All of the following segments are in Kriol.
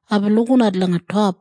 Aibin lukinat langa top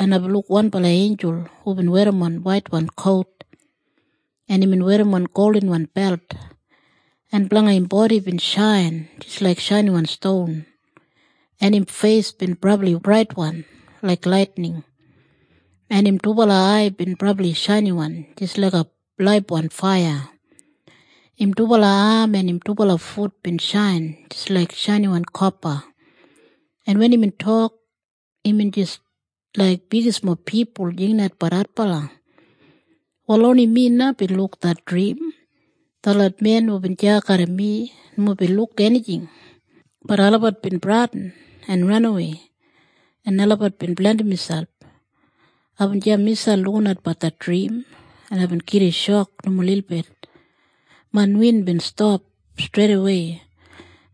en aibin luk wanbala einjul hubin werrimon waitwan kout, en imbin werrimon goldinwan belt. En blanga im bodi bin shain jis laik shainiwan ston, en im feis bin brabli braitwan laik laitining. En im dubala ai bin brabli shainiwan jis laiga laibwan faiya. Im dubala am en im dubala fut bin shain jis laik shainiwan kopa, en wen imbin tok, imbin jis laik bigismob pipul jinginatbat adbala. “Wal oni mi na bin luk det drim. Detlot men hubin deya garram mi nomo bin luk enijing, bat olabat bin bradin en ranawei en olabat bin blandim miselp. Aibin deya miselp lukinatbat det drim en aibin gida shok nomo lilbit. Main win bin stap streidawei,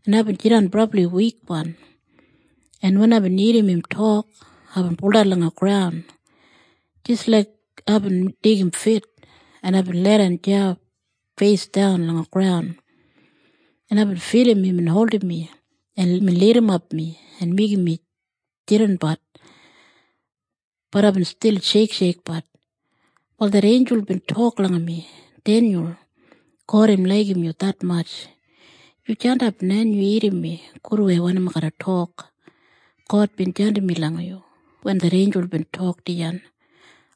en aibin jidan brabli wikwan. En wen aibin irrim im tok, aibin buldan langa graun jis laik aibin deigim fit en aibin leidan deya feisdan langa graun. En aibin filim imbin holdim mi en imbin lidimap mi en imbin meigim mi jidanbat, bat aibin stil sheiksheikbat. “Wal det einjul bin tok langa mi, ‘Denyul, God im laigim yu detmatj. Yu jandap na en yu irrim mi gudwei wanim ai garra tok. God bin jandim mi langa yu.’ Wen det einjul bin tok dijan,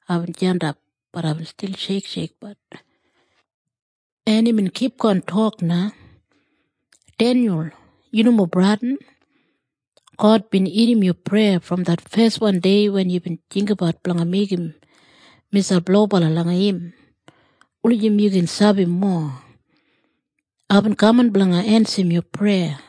aibin jandap bat aibin stil sheiksheikbat. “En imbin kipgon tok na, ‘Denyul, yu nomo bradin. God bin irrim yu preya brom det feswan dei wen yubin jinggabat blanga meigim miselp lobala langa im wulijim yu gin sabi mowa. Aibin kaman blanga ensim yu preya.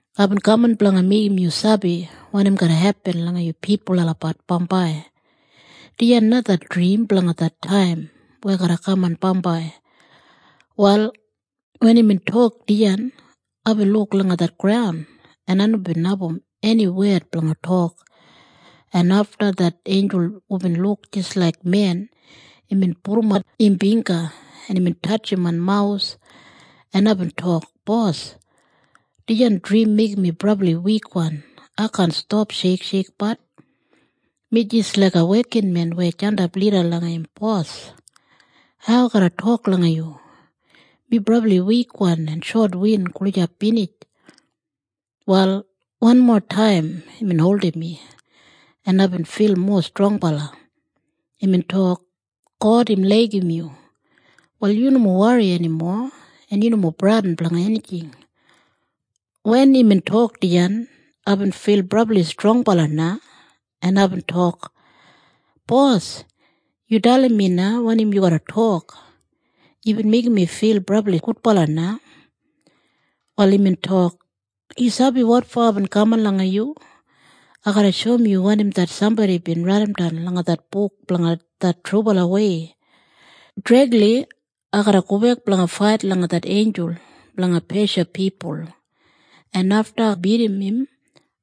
Aibin kaman blanga meigim yu sabi wanim garra hepin langa yu pipul olabat bambai. Dijan na det drim blanga det taim weya garra kaman bambai.’ “Wal wen imbin tok dijan, aibin luk langa det graun en ai nomo bin abum eni wed blanga tok. En afta det einjul hubin luk jis laik men, imbin pudumat im bingga, en imbin tatjim main mawus en aibin tok, ‘Bos, dijan drim meigim mi brabli wikwan. Ai kaan stap sheiksheikbat. Mi jis laiga wekinmen weya jandap lida langa im bos. Hau ai garra tok langa yu? Mi brabli wikwan en shotwin gulijap binij.’ “Wal wanmo taim imbin holdim mi, en aibin fil mowa strongbala. Imbin tok, ‘God im laigim yu. Wal yu nomo wori enimo, en yu nomo bradin blanga enijing.’ “Wen imbin tok dijan, aibin fil brabli strongbala na, en aibin tok, ‘Bos, yu dalim mi na wanim yu garra tok. Yubin meigim mi fil brabli gudbala na.’ “Wal imbin tok, ‘Yu sabi wotfo aibin kaman langa yu? Ai garra shoum yu wanim det sambodi bin raidimdan langa det Buk Blanga Det Trubalawei. Dregli ai garra gobek blanga fait langa det einjul blanga Pesha pipul, en afta ai bidim im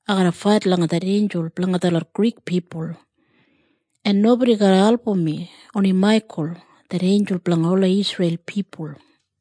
ai garra fait langa det einjul blanga detlot Grik pipul. En nobodi garra album mi, oni Maikul, det einjul blanga ola Isreil pipul.’”